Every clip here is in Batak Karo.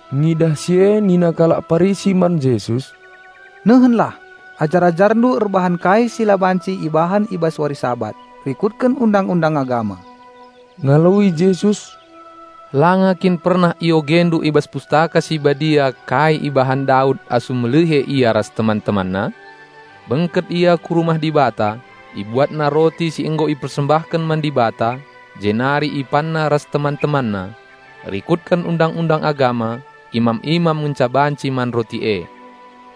Ngidah si e nina kalak Parisi man Jesus, "Nehenlah, ajar-AjarNdu erbahan kai si la banci ibahan i bas wari Sabat rikutken Undang-undang Agama." Ngaloi Jesus, "Langa kin pernah iogendu i bas Pustaka Si Badia kai ibahan Daud asum melihe ia ras teman-temanna? Bengket ia ku rumah Dibata, ibuatna roti si nggo ipersembahken man Dibata, jenari ipanna ras teman-temanna. Rikutken Undang-undang Agama, imam-imam ngenca banci man roti e.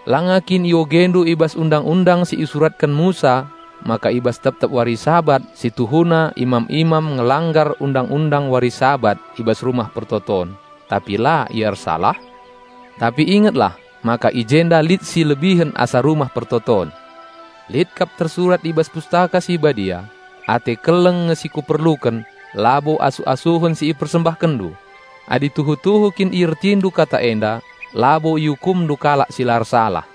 Langa kin iogendu i bas Undang-undang si isuratken Musa maka i bas tep-tep wari Sabat si tuhuna imam-imam ngelanggar Undang-undang wari Sabat i bas Rumah Pertoton, tapi la ia ersalah? Tapi ingetlah, maka i jenda lit si lebihen asa Rumah Pertoton. Lit kap tersurat i bas Pustaka Si Badia, 'Ate keleng nge si Kuperluken, labo asuh-asuhen si ipersembahkenndu.' Adi tuhu-tuhu kin iertindu kata enda, labo iukumndu kalak si la ersalah.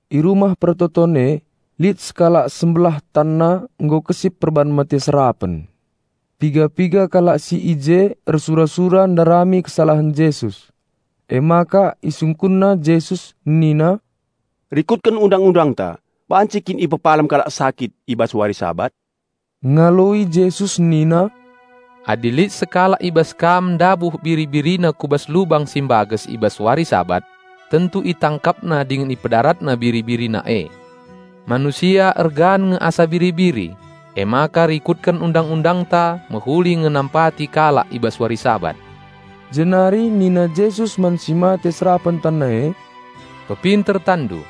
I rumah persembahen e lit sekalak sembelah tanna nggo kesip perban mate serapen. Piga-piga kalak si i je ersura-sura ndarami kesalahen Jesus. Emaka isungkunna Jesus nina, "Rikutken Undang-undangta, banci kin ipepalem kalak sakit i bas wari Sabat?" Ngaloi Jesus nina, "Adi lit sekalak i bas kam ndabuh biri-birina ku bas lubang si mbages i bas wari Sabat, tentu itangkapna dingen ipedaratna biri-birina e. Manusia ergan nge asa biri-biri! Emaka rikutken Undang-undangta mehuli nge nampati kalak i bas wari Sabat." Jenari nina Jesus man si mate serapen tanna e, "Pepinter tanndu."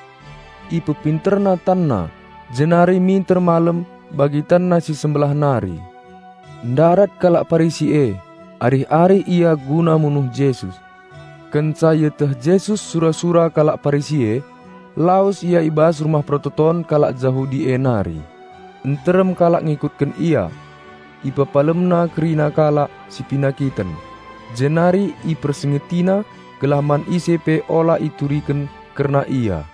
Ipepinterna tanna, jenari minter malem bagi tanna si sembelah nari. Ndarat kalak Parisi e, arih-arih ia guna munuh Jesus. Kenca ieteh Jesus sura-sura kalak Parisi e, lawes Ia i bas rumah persembahen kalak Jahudi e nari. Nterem kalak ngikutken Ia. IpepalemNa kerina kalak si penakiten, jenari IpersingetiNa gelah man ise pe ula ituriken kerna Ia.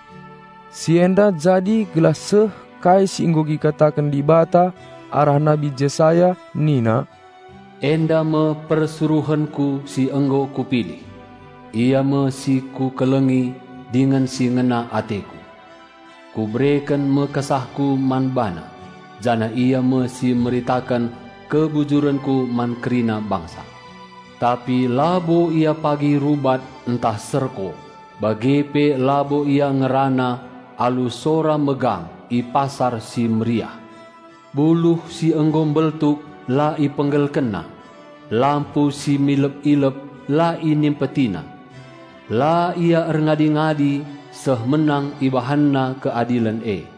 Si enda jadi gelah seh kai si nggo ikataken Dibata arah Nabi Jesaya nina, "Enda me persuruhenKu si nggo Kupilih, Ia me si Kukelengi dingen si ngena ateKu. Kubereken me KesahKu man BaNa, janah Ia me si meritaken kebujurenKu man kerina bangsa. Tapi labo Ia pagi rubat ntah serko bage pe labo Ia ngerana alu sora megang i pasar si meriah. Buluh si nggo mbeltuk la IpenggelkenNa, lampu si midep-idep la InimpetiNa, la Ia erngadi-ngadi seh menang IbahanNa keadilen e.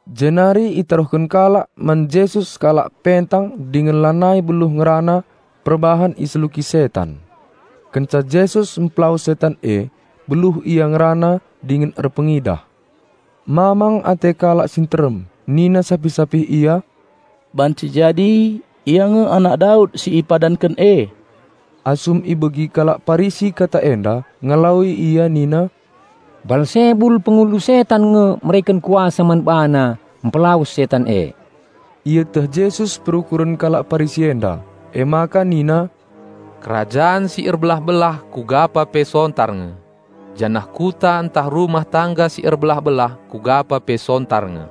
Jenari itaruhken kalak man Jesus sekalak pentang dingen lanai beluh ngerana perbahan iseluki setan. Kenca Jesus mpelawes setan e, beluh ia ngerana dingen erpengidah. Mamang ate kalak si nterem nina sapih-sapih ia, "Banci jadi Ia nge Anak Daud si ipadanken e." Asum ibegi kalak Parisi kata enda ngaloi ia nina, "Balsebul pengulu setan nge mereken kuasa man BaNa mpelawes setan e." Ieteh Jesus perukuren kalak Parisi enda emaka nina, "Kerajan si erbelah-belah kugapa pe sontar nge. Janah kuta ntah rumah tangga si erbelah-belah kugapa pe sontar nge.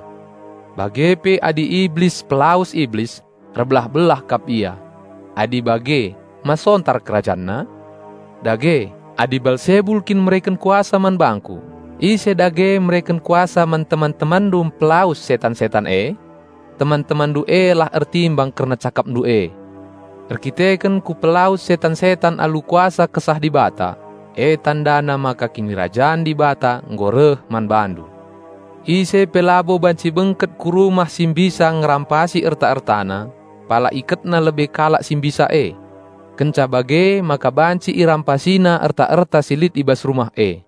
Bage pe adi Iblis pelawes Iblis, erbelah-belah kap ia. Adi bage ma sontar kerajanna? Dage, adi Balsebul kin mereken kuasa man bangKu, ise dage mereken kuasa man teman-temanndu mpelawes setan-setan e? Teman-temanndu e lah ertimbang kerna cakapndu e. Erkiteken Kupelawes setan-setan alu kuasa Kesah Dibata, e tandana maka Kinirajan Dibata nggo reh man bandu. Ise pe labo banci bengket ku rumah si mbisa ngerampasi erta-ertana, pala iketna lebe kalak si mbisa e. Kenca bage maka banci irampasina erta-erta si lit i bas rumah e.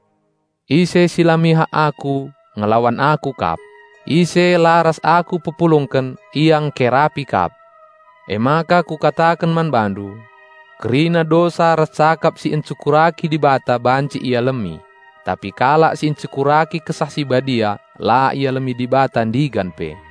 Ise si Ia mihak aku ngelawan Aku kap; ise la ras Aku pepulungken, ia engkerapi kap. Emaka Kukataken man bandu: Kerina dosa ras cakap si encurnahen Dibata banci ialemi; tapi kalak si encurnahen Kesah Si Badia la ialemi Dibata ndigan pe.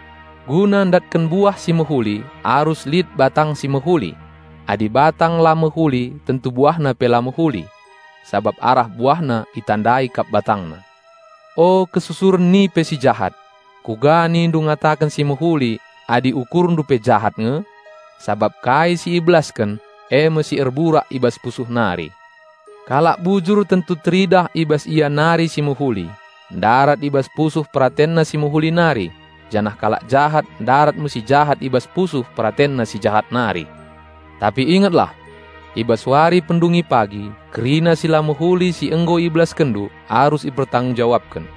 "Guna ndatken buah si mehuli arus lit batang si mehuli; adi batang la mehuli tentu buahna pe la mehuli. Sabap batang itandai arah buahna kap. O, kalak jahat! Kuga nindu ngataken si mehuli adi ukurndu pe jahat nge? Sabap kai si ibelasken, e me si erburak i bas pusuh nari. Kalak bujur tentu teridah i bas ia nari si mehuli, ndarat i bas pusuh peratenna si mehuli nari; janah kalak jahat ndarat me si jahat i bas pusuh peratenna si jahat nari." "Tapi ingetlah! I bas wari pendungi pagi kerina si la mehuli si nggo ibelaskenndu arus ipertanggung-jawabken.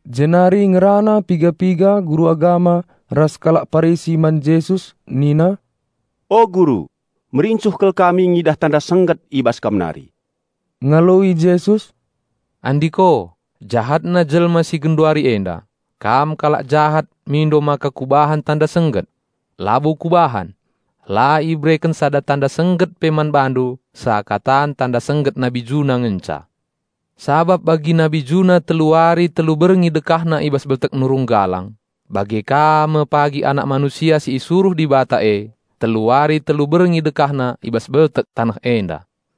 Jenari ngerana piga-piga guru agama ras kalak Parisi man Jesus nina, "O Guru, merincuh kal kami ngidah tanda sengget i bas Kam nari." Ngaloi Jesus, "Andiko, jahatna jelma si genduari enda! Kam kalak jahat mindo maka Kubahan tanda sengget? Labo Kubahan! La ibereken sada tanda sengget pe man bandu seakatan tanda sengget Nabi Juna ngenca. Sabap bagi Nabi Juna telu wari telu berngi dekahna i bas beltek nurung galang, bage ka me pagi Anak Manusia si isuruh Dibata e telu wari telu berngi dekahna i bas beltek taneh enda.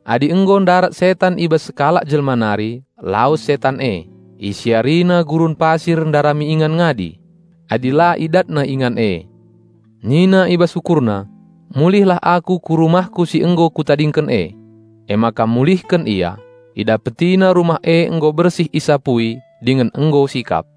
"Adi nggo ndarat setan i bas sekalak jelma nari, lawes setan e, isiarina gurun pasir ndarami ingan ngadi. Adi la idatna ingan e, nina i bas ukurna, 'Mulihlah aku ku rumahku si nggo kutadingken e.' Emaka mulihken ia, idapetina rumah e nggo bersih isapui dingen nggo sikap.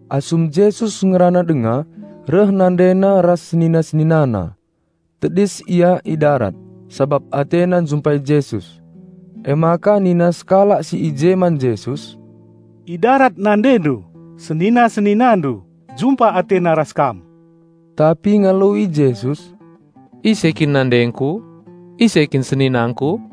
Asum Jesus ngerana denga, reh NandeNa ras senina-SeninaNa. Tedis ia i darat, sabap atena njumpai Jesus. Emaka nina sekalak si i je man Jesus, "I darat NandeNdu, senina-SeninaNdu, jumpa atena ras Kam." Tapi ngaloi Jesus, "Ise kin nandengKu? Ise kin seninangKu?"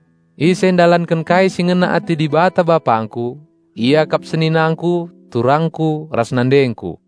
Ise ndalanken kai si ngena ate Dibata, BapangKu, ia kap seninangKu, turangKu, ras nandengKu."